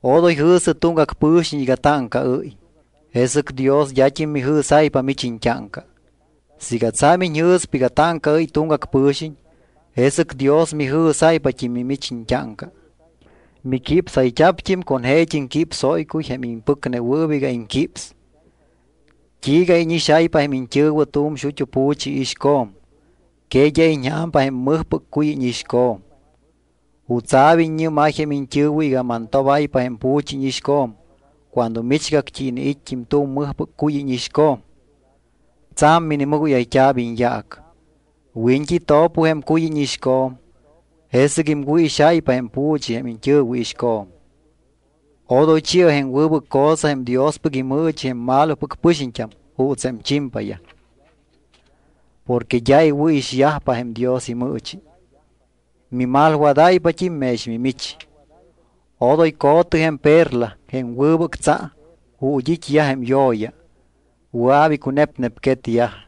’Odoy jɨ̱sɨ tuŋgac pɨ̱xiñ iga táŋcaɨ́y, jesɨc Dios d́at́im mijɨ̱sáypa mich iñt́áŋca. Siiga tsa̱m iñjɨ̱spa iga táŋcaɨ́y tuŋgac pɨ̱xiñ, jesɨc Dios mijɨ̱sáypat́im mimich iñt́áŋca. Miquípsayt́a̱pt́im con jeet́im quipsóycuy jém impɨcnewɨɨp iga iŋquíps. ¿T́iiga íñixáypa jém iñt́ɨ̱wɨ tu̱m xut́u pu̱chi iixco̱m? ¿Que d́a iñja̱mpa jém mɨjpɨc cuy íñixco̱m? ¿Jutsa̱p iññɨ́máy jém iñt́ɨ̱wɨ iga mantobáypa jém pu̱chi íñixco̱m cuando michgact́i iniit́t́im tu̱m mɨjpɨc cuy íñixco̱m? Tsa̱m minimɨgóyayt́a̱p iñyaac. Wiñt́i to̱pɨ jém cuy íñixco̱m, jesɨc iŋwɨ̱ixáypa jém pu̱chi jém iñt́ɨ̱wɨ iixco̱m. ’Odoy chi̱ɨ jém wɨbɨc cosa jém Diospɨc imɨɨchi jém malopɨc pɨxiñt́am juuts jém chimpayaj. Porque d́a iwɨ̱ixyajpa jém Dios imɨɨchi, mimalwadáypat́im mex mimich. Odoy co̱tɨ jém perla, jém wɨbɨc tsa, ju̱t́ it́yaj jém yo̱ya. Wɨa̱p icunepnepquetyaj.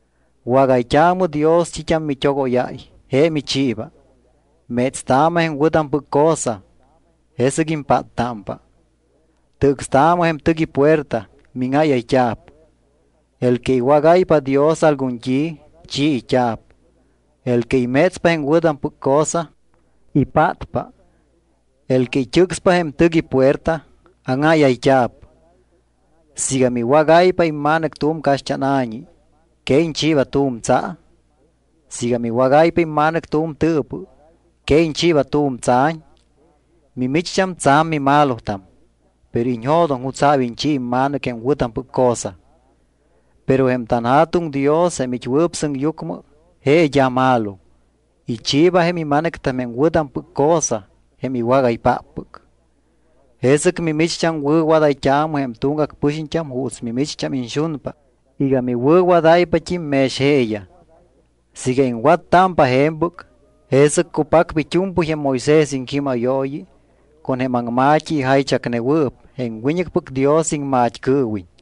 ’Wágayt́aamɨ Dios t́it́am mit́ogóyáy, je michiiba. Métstaamɨ jém wɨ̱tampɨc cosa, jesɨc impáttámpa. Tɨcstaamɨ jém tɨc ipuerta, míŋáyayt́a̱p. El que iwágáypa Dios algun t́i, chiit́a̱p. El que imétspa jém wɨ̱tampɨc cosa, ipátpa. El que it́ɨcspa jém tɨc ipuerta, áŋáyayt́a̱p. ’Siiga miwágáypa imma̱nɨc tu̱m caxt́ána̱ñi, ¿que iñchiiba tu̱m tsa? Siiga miwágáypa imma̱nɨc tu̱m tɨɨpɨ, ¿que iñchiiba tu̱m tsa̱ñ? Mimicht́am tsa̱m mimalotam, pero iñjo̱doŋ jutsa̱p iñchi imma̱nɨc jém wɨ̱tampɨc cosa. Pero jém tanJa̱tuŋ Dios, jém it́wɨɨp sɨŋyucmɨ, je d́a malo; ichiiba jém ima̱nɨctam jém wɨ̱tampɨc cosa jém iwágaypáppɨc. ’Jesɨc mimicht́am wɨ̱wadayt́aamɨ jém tuŋgac pɨxiñt́am juuts mimicht́am iñxunpa iga miwɨ̱wadáypat́im mex jeeyaj. Siiga iŋwattámpa je̱mpɨc, jesɨc cupacpa it́u̱mpɨy jém Moisés iŋquímayooyi con jém aŋma̱t́i ijaychacnewɨɨp jém wiñɨcpɨc Dios iŋmat́cɨɨwiñ.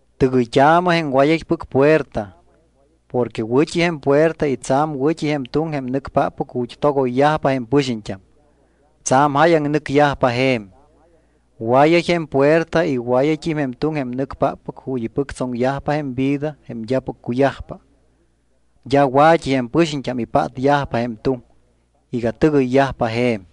’Tɨgɨyt́aamɨ jém wayaypɨc puerta. Porque wɨ̱t́i jém puerta y tsa̱m wɨ̱t́i jém tuŋ jém nɨcpáppɨc ju̱t́ togoyyajpa jém pɨxiñt́am. Tsa̱m jáyaŋ nɨcyajpa je̱m. Wayay jém puerta y wayayt́im jém tuŋ jém nɨcpáppɨc ju̱t́ ipɨctsoŋyajpa jém vida jém d́apɨc cuyajpa. D́a wa̱t́i jém pɨxiñt́am ipátyajpa jém tuŋ iga tɨgɨyyajpa je̱m.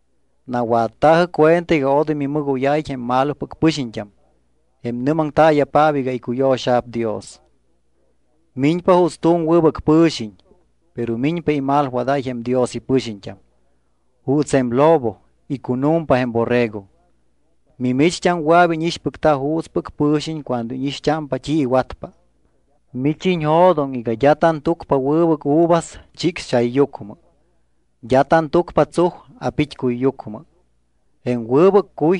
’Nawatta̱jɨ cuenta iga odoy mimɨgóyáyiñ jém malopɨc pɨxiñt́am, jém nɨ́maŋtaaya̱paap iga icuyo̱xa̱p Dios. Miñpa juuts tu̱m wɨbɨc pɨ̱xiñ, pero miñpa imalwadáy jém Dios ipɨxiñt́am. Juuts jém lobo icunu̱mpa jém borrego. Mimicht́am wɨa̱p íñixpɨcta juutspɨc pɨ̱xiñ cuando íñixt́ámpa t́i iwatpa. Mich iñjo̱doŋ iga d́a tantúcpa wɨbɨc uvas chicxchayyucmɨ. D́a tantúcpa tsuj a̱pit́cuyyucmɨ. Jém wɨbɨc cuy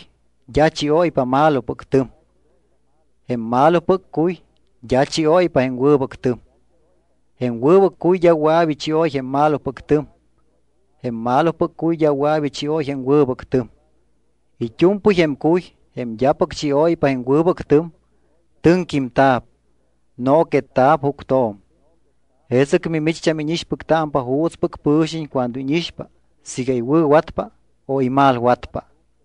d́a chióypa malopɨc tɨm. Jém malopɨc cuy d́a chióypa jém wɨbɨc tɨm. Jém wɨbɨc cuy d́a wɨa̱p ichióy jém malopɨc tɨm. Jém malopɨc cuy d́a wɨa̱p ichióy jém wɨbɨc tɨm. It́u̱mpɨy jém cuy, jém d́apɨc chióypa jém wɨbɨc tɨm, tɨŋquímta̱p. Nooquetta̱p juctjo̱m. Jesɨc mimicht́am íñixpɨctámpa juutspɨc pɨ̱xiñ cuando íñixpa siiga iwɨ̱watpa o imalwatpa.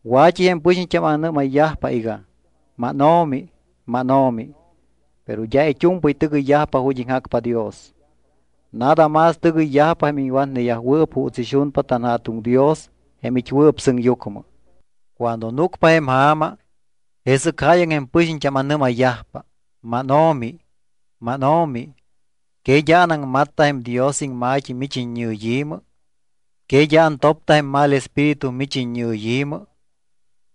’Wa̱t́i jém pɨxiñt́am anɨ́mayyajpa iga: “MánO̱mi, mánO̱mi”, pero d́a it́u̱mpɨy tɨgɨyyajpa ju̱t́ iŋjacpa Dios. Nada más tɨgɨyyajpa jém iwatneyajwɨɨp juuts ixunpa tanJa̱tuŋ Dios jém it́wɨɨp sɨŋyucmɨ. Cuando núcpa jém ja̱ma, jesɨc jáyaŋ jém pɨxiñt́am anɨ́mayyajpa: “MánO̱mi, mánO̱mi, ¿que d́a anaŋmatta jém Dios iŋma̱t́i mich iññɨyi̱mɨ, que d́a antopta jém mal espíritu mich iññɨyi̱mɨ,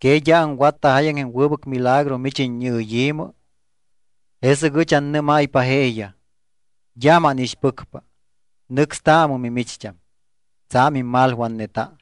que d́a aŋwatta jáyaŋ jém wɨbɨc milagro mich iññɨyi̱mɨ?” Jesɨc ɨch annɨ́máypa jeeyaj: “D́a mánixpɨcpa. Nɨcstaamɨ mimicht́am, tsa̱m immalwatneta.”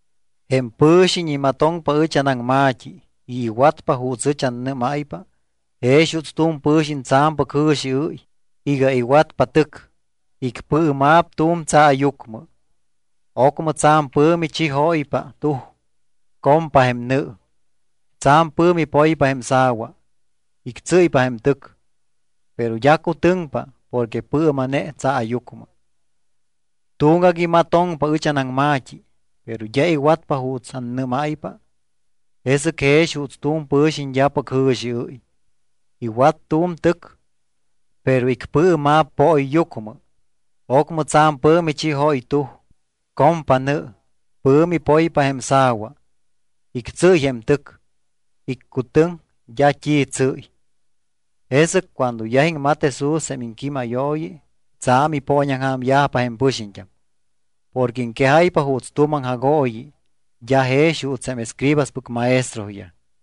’Jém pɨ̱xiñ imatoŋpa ɨch anaŋma̱t́i y iwatpa juuts annɨ́máypa jex juuts tu̱m pɨ̱xiñ tsa̱mpɨc jɨ̱xiɨ́y iga iwatpa tɨc. Icpɨɨma̱p tu̱m tsaayucmɨ. Ocmɨ tsa̱m pɨ̱mi chijóypa tuj. Compa jém nɨ. Tsa̱m pɨ̱mi poypa jém sa̱wa. Ictsɨ́ypa jém tɨc, pero d́a cutɨŋpa porque pɨɨma̱ne tsaayucmɨ. Tuŋgac imatoŋpa ɨch anaŋma̱t́i, pero d́a iwatpa juuts annɨ́máypa. Je jex juuts tu̱m pɨ̱xiñ d́apɨc jɨ̱xiɨ́y. Iwat tu̱m tɨc, pero icpɨɨma̱p pooyyucmɨ. Ocmɨ tsa̱m pɨ̱mi chijóy tuj, compa nɨ, pɨ̱mi poypa jém sa̱wa. Ictsɨ́y jém tɨc, iccutɨŋ, d́a t́i tsɨ́y. Jesɨc cuando yaj iŋmat Jesús jém iŋquímayooyi tsa̱m ipooñaŋja̱myajpa jém pɨxiñt́am, porque iŋquejáypa juuts tu̱m aŋjagooyi d́a jex juuts jém escribaspɨc maestroyaj.